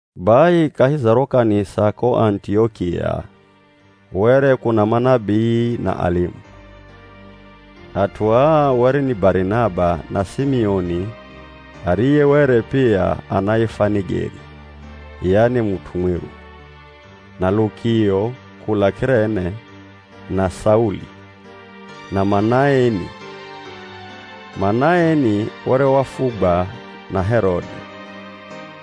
Bai kahi za ro kanisa ko Anitiokia were kuna manabii na alimu. At'u aa were ni, Barinaba na Simioni ariye were pia anaifwa Nigeri (yani mut'u mwiru) na Lukio kula K'irene, na Sauli, na Manaeni (Manaeni were wafugwa na Herode).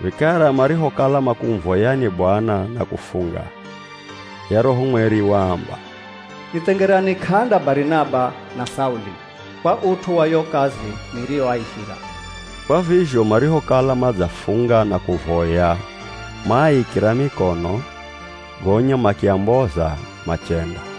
Vikara marihokala makumuvoyani Bwana na kufunga, ye Roho Mweri waamba, “Nithengerani k'anda Barinaba na Sauli kwa ut'u wa yo kazi niriyoaihira.” Kwa vizho marihokala madzafunga na kuvoya maaikira mikono gonya makiamboza machenda.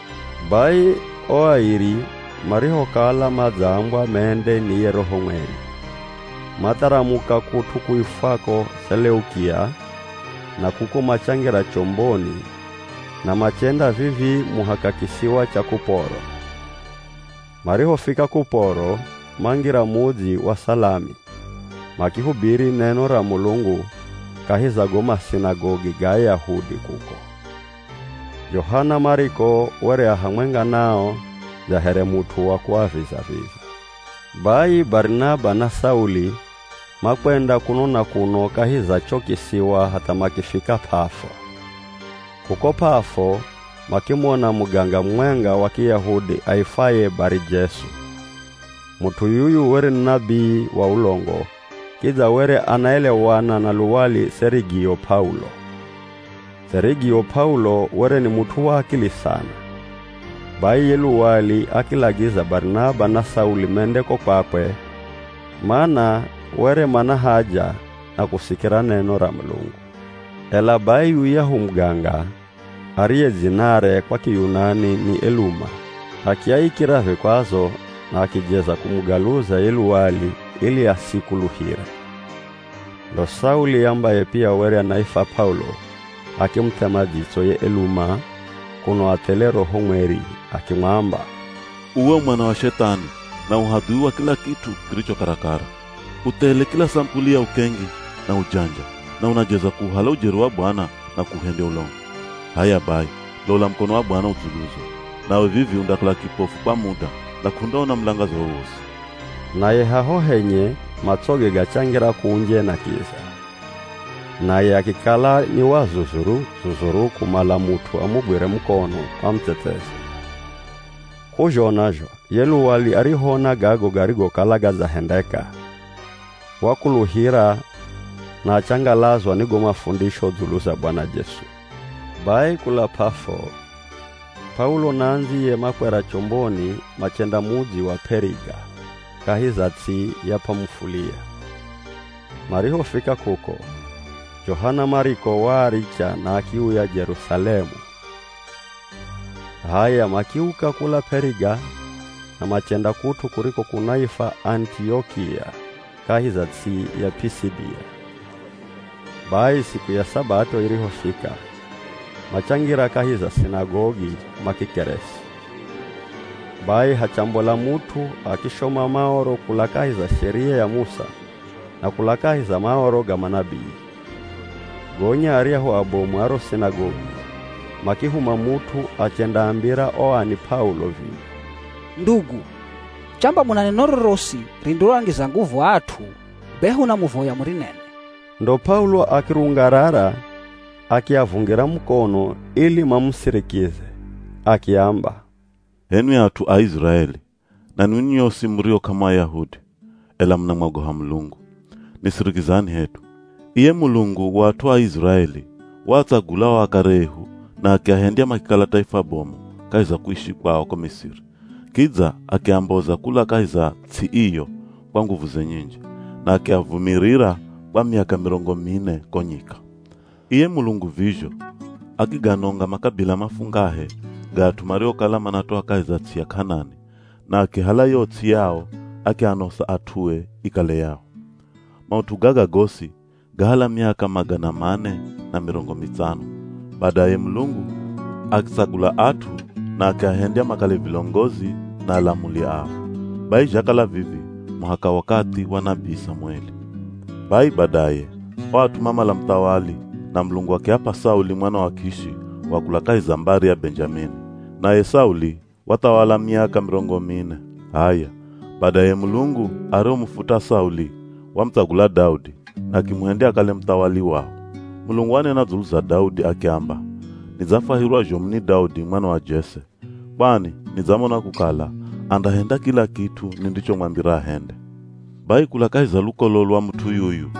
Bai o airi marihokala madzaambwa mende ni ye Roho Mweri, matharamuka kut'u kuifwako Seleukia na kuko machangira chomboni na machenda vivii muhaka kisiwa cha Kuporo. Marihofika Kuporo mangira mudzi wa Salami, makihubiri neno ra Mulungu kahi za go masinagogi ga Ayahudi kuko. Johana Mariko were a hamwenga nao dza here mut'u wa kuaviza-viza. Bai Barinaba na Sauli makwenda kuno na kuno kahi za cho kisiwa hatha makifika P'afo, kuko P'afo makimona muganga mumwenga wa Kiyahudi aifwaye Bari-Jesu. Mut'u yuyu were ni nabii wa ulongo, kidza were anaelewana na luwali Serigio P'aulo. Serigio P'aulo were ni mut'u wa akili sana. Bai ye luwali akilagiza Barinaba na Sauli mende ko kwakwe mana were mana haja na kusikira neno ra Mulungu. Ela bai yuyahu muganga, ariye dzinare kwa Kiyunani ni Eluma, akiaikira vikwazo na akijeza kumugaluza ye luwali ili asikuluhire. Ndo Sauli, ambaye pia were anaifwa P'aulo, akimuthema dzitso ye Eluma kuno athele Roho Mweri, akimwamba, “Uwe u mwana wa Shethani na u hadhui wa kila kit'u kiricho karakara! U thele kila samupuli ya ukengi na ujanja na unajeza kuuhala ujeri wa Bwana na kuuhendya ulongo. H'aya bai, lola mukono wa Bwana u dzuluzo, nawe vivi undakala kipofu kwa muda na k'undaona mulangaza wowosi.” Naye haho henye matsoge gachangira kunje na kiza, naye akikala ni wa zuzuru-zuzuru kumala mut'u amugwire mukono amutsetseze. K'uzhona zho ye luwali arihoona gago garigokala gadzahendeka, wakuluhira na achangalazwa ni go mafundisho dzulu za Bwana Jesu. Bai kula P'afo, P'aulo na andziye makwera chomboni machenda mudzi wa P'eriga kahi za ts'i ya P'amufulia. Marihofika kuko, Johana Mariko waaricha na akiuya Jerusalemu. H'aya makiuka kula P'eriga na machenda kut'u kuriko kunaifwa Anitiokia kahi za ts'i ya P'isidia. Bai siku ya Sabato irihofika machangira kahi za sinagogi makikeresi. Bai hachambola mut'u akishoma Maoro kula kahi za Sheria ya Musa na kula kahi za Maoro ga manabii. Gonya aryahu abomu a ro sinagogi makihuma mut'u achendaambira o ani P'aulo vivi, “Ndugu, chamba muna neno rorosi rindiroangiza nguvu aa at'u be hunamuvoya murinene.” Ndo P'aulo akirungarara akiavungira mukono ili mamusirikize, akiamba, “H'enwi at'u a Iziraeli na ninwi nyosi murio k'amu Ayahudi, ela munamwogoha Mulungu, nisirikizani hedu! Iye Mulungu wa at'u a Iziraeli waatsagula o akare ehu na akiahendya makikala taifa bomu kahi za kuishi kwao ko Misiri, kidza akiamboza kula kahi za ts'i iyo kwa nguvuze nyinji, na akiavumirira kwa miaka mirongo mine ko nyika. Iye Mulungu vizho, akiganonga makabila mafungahe ga at'u mariokala manatoa kahi za ts'i ya K'anani na akihala yo ts'i yao akianosa at'ue ikale yao. Maut'u gaga gosi gahala miaka magana mane na mirongo mitsano, badaye Mulungu akitsagula at'u na akiahendya makale vilongozi na alamuli ao, bai zhakala vivi muhaka wakathi wa nabii Samueli. Bai badaye, o at'u mamala muthawali na Mulungu akiap'a Sauli mwana wa Kishi wa kula kahi za mbari ya Benjamini, naye Sauli wathawala miaka mirongo mine. H'aya, badaye Mulungu arihomufuta Sauli, wamutsagula Daudi na akimuhendya akale muthawali wao. Mulungu wanena dzulu za Daudi akiamba, ‘Nidzafwahirwa zhomu ni Daudi mwana wa Jese. Kwani nidzamona kukala andahenda kila kit'u nindichomwambira ahende.’ Bai kula kahi za lukolo lwa mut'u yuyu,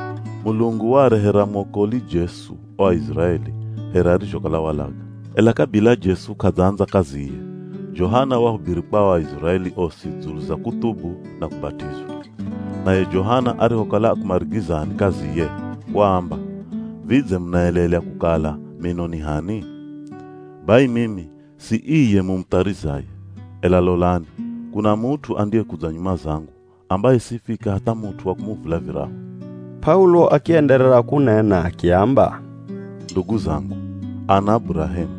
Mulungu waarehera mwokoli Jesu o Aiziraeli here arizhokala walaga. Ela kabila Jesu k'adzaandza kaziye, Johana wahubiri kwa o Aiziraeli osi dzulu za kuthubu na kubat'izwa. Naye Johana arihokala akumarigizani kaziye, waamba, ‘Vidze munaelelya kukala mino ni h'ani? Bai mimi si iye mumutharizaye, ela lolani, kuna mut'u andiyekudza nyuma zangu ambaye sifika hatha mut'u wa kumuvula virahu.’” P'aulo akienderera kunena akiamba, “Ndugu zangu, ana a Burahemu,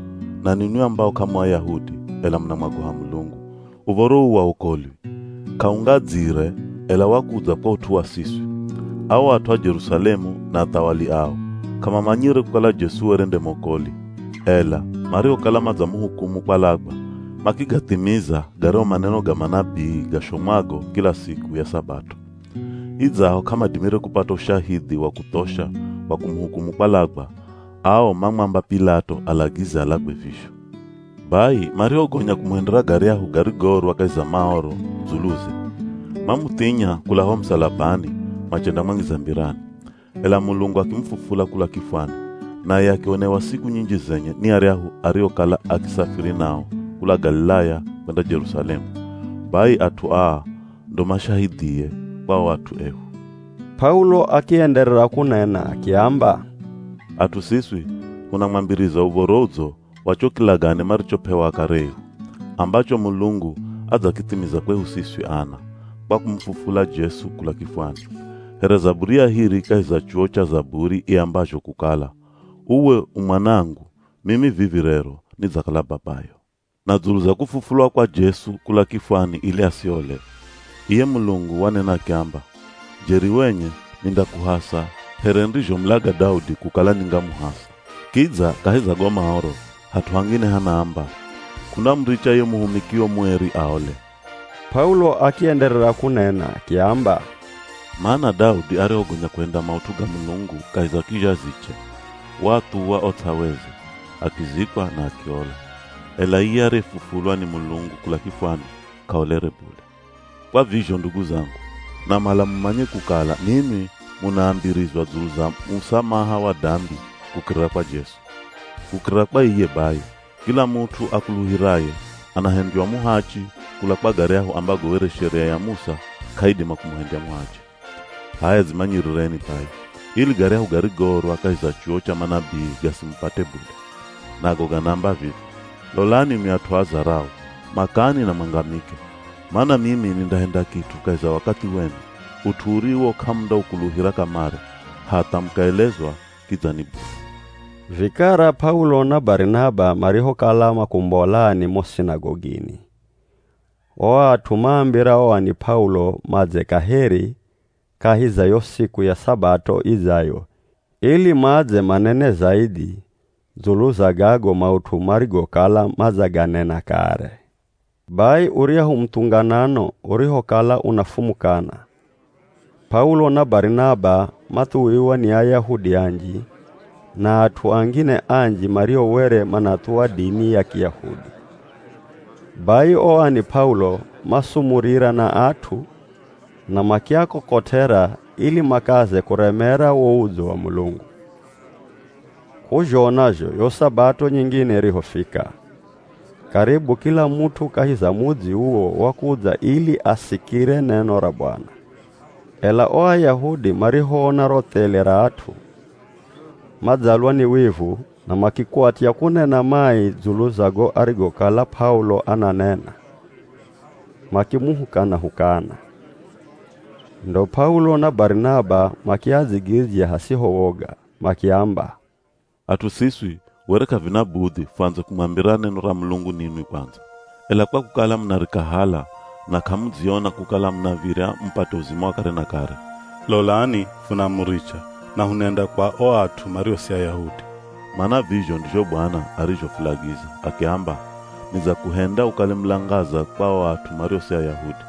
na ninwi ambao k'amu Ayahudi ela munamwogoha Mulungu, uv̱oro uu wa wokolwi, k'aungadzire, ela wakudza kwa ut'u wa siswi. Ao at'u a Jerusalemu na athawali ao k'amamanyire kukala Jesu were nde mwokoli, ela marihokala madzamuhukumu kwalagwa makigathimiza garyahu maneno ga manabii gashomwago kila siku ya Sabato. Idzaho k'amadimire kupata ushahidhi wa kuthosha wa kumuhukumu kwalagwa, ao mamwamba P'ilato alagize alagwe vizho. Bai marihogonya kumuhendera garyahu garigoorwa kahi za Maoro dzuluze, mamuthinya kula ho musalabani machendamwangiza mbirani. Ela Mulungu akimufufula kula kifwani, naye akionewa siku nyinji zenye ni aryahu ariokala akisafiri nao kula Galilaya kwenda Jerusalemu, Bai at'u aa ndo mashahidhie kwa o at'u ehu.” P'aulo akienderera kunena akiamba, “At'u siswi hunamwambiriza Uv̱oro Udzo wa cho kilagane marichop'ewa akare ehu, ambacho Mulungu adzakithimiza kwehu siswi ana, kwa kumufufula Jesu kula kifwani. Here zaburi ya hiri kahi za chuwo cha Zaburi iambazho kukala, ‘Uwe u Mwanangu, mimi vivi rero nidzakala Babayo.’ Na dzulu za kufufulwa kwa Jesu kula kifwani ili asiole, iye Mulungu wanena akiamba, ‘Jeri wenye nindakuhasa here nirizhomulaga Daudi kukala ningamuhasa.’ Kidza kahi za go Maoro, hat'u hangine hanaamba, ‘K'undamuricha ye muhumikio mueri aole.’” P'aulo akienderera kunena akiamba, “Mana Daudi arihogonya kuhenda maut'u ga Mulungu kahi za kizhaziche, waathuwa o ts'aweze, akizikwa na akiola. Ela iye ariyefufulwa ni Mulungu kula kifwani k'aolere bule. Kwa vizho ndugu zangu, namala mumanye kukala ninwi munaambirizwa dzulu za musamaha wa dambi kukirira kwa Jesu. Kukirira kwa iye bai, kila mut'u akuluhiraye anahendywa muhachi kula kwa garyahu ambago were Sheria ya Musa k'aidima kumuhendya muhachi. H'aya dzimanyirireni bai, ili garyahu garigoorwa kahi za chuwo cha manabii gasimupate bule. Nago ganaamba vivi: ‘Lolani nwi at'u a zarau, makani na mwangamike. Mana mimi nindahenda kit'u kahi za wakathi wenu, ut'u uriwo k'amundaukuluhira kamare, hatha mukaelezwa kidza ni bule.’” Vikara P'aulo na Barinaba marihokala makumbolani mo sinagogini, o at'u maambira o ani P'aulo madze kaheri kahi za yo siku ya Sabato idzayo ili madze manene zaidhi dzulu za gago maut'u marigokala madzaganena kare. Bai uryahu muthunganano urihokala unafumukana, P'aulo na Barinaba mathuwiwa ni Ayahudi anji na at'u angine anji mario were manathuwa dini ya Kiyahudi, bai o ani P'aulo masumurira na at'u na makiakokot'era ili makaze kuremera wo udzo wa Mulungu. K'uzhona zho yo Sabato nyingine irihofika, karibu kila mut'u kahi za mudzi uwo wakudza ili asikire neno ra Bwana. Ela o Ayahudi marihoona ro thele ra at'u, madzalwa ni wivu na makikwatya kunena mai dzulu za go arigokala P'aulo ananena, makimuhukana-hukana. Ndo P'aulo na Barinaba makiadzigidzya hasiho woga makiamba, “At'u siswi were k'avina budhi fuandze kumwambira neno ra Mulungu ninwi kwandza, ela kwa kukala munarikahala na k'amudziona kukala munav̱irya mupate uzima wa kare na kare, lolani funamuricha na hunenda kwa o at'u mario si Ayahudi. Mana vizho ndizho Bwana arizhofulagiza, akiamba, ‘Nidzakuhenda ukale mulangaza kwa o at'u mario si Ayahudi,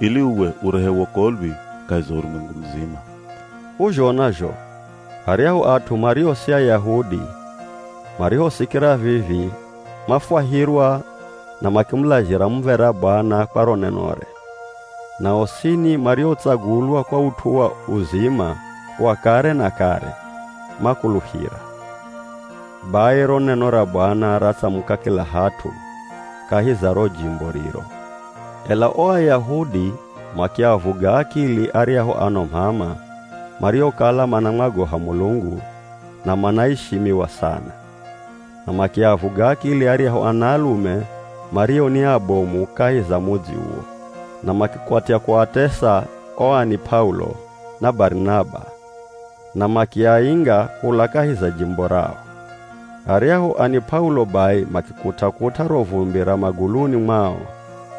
ili uwe urehe wokolwi kahi za urumwengu muzima.’” K'uzhona zho aryahu at'u mario si Ayahudi marihosikira vivi mafwahirwa na makimulazhira muv̱era Bwana kwa ro nenore, na osini mariotsagulwa kwa ut'u wa uzima wa kare na kare, makuluhira. Bai ro neno ra Bwana ratsamuka kila hat'u kahi za ro jimbo riro. Ela o Ayahudi makiavuga akili aryahu ano m'ama mariokala manamwagoha Mulungu na manaishimiwa sana, na makiavuga akili aryahu anaalume mario ni abomu kahi za mudzi uwo, na makikwatya kuatesa o ani P'aulo na Barinaba na makiainga kula kahi za jimbo rao. Aryahu ani P'aulo bai makikut'a-kut'a ro vumbi ra maguluni mwao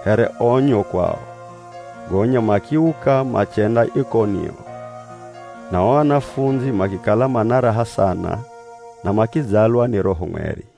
here onyo kwao, gonya makiuka machenda Ikonio. Na o anafundzi makikala mana raha sana na makidzalwa ni Roho Mweri.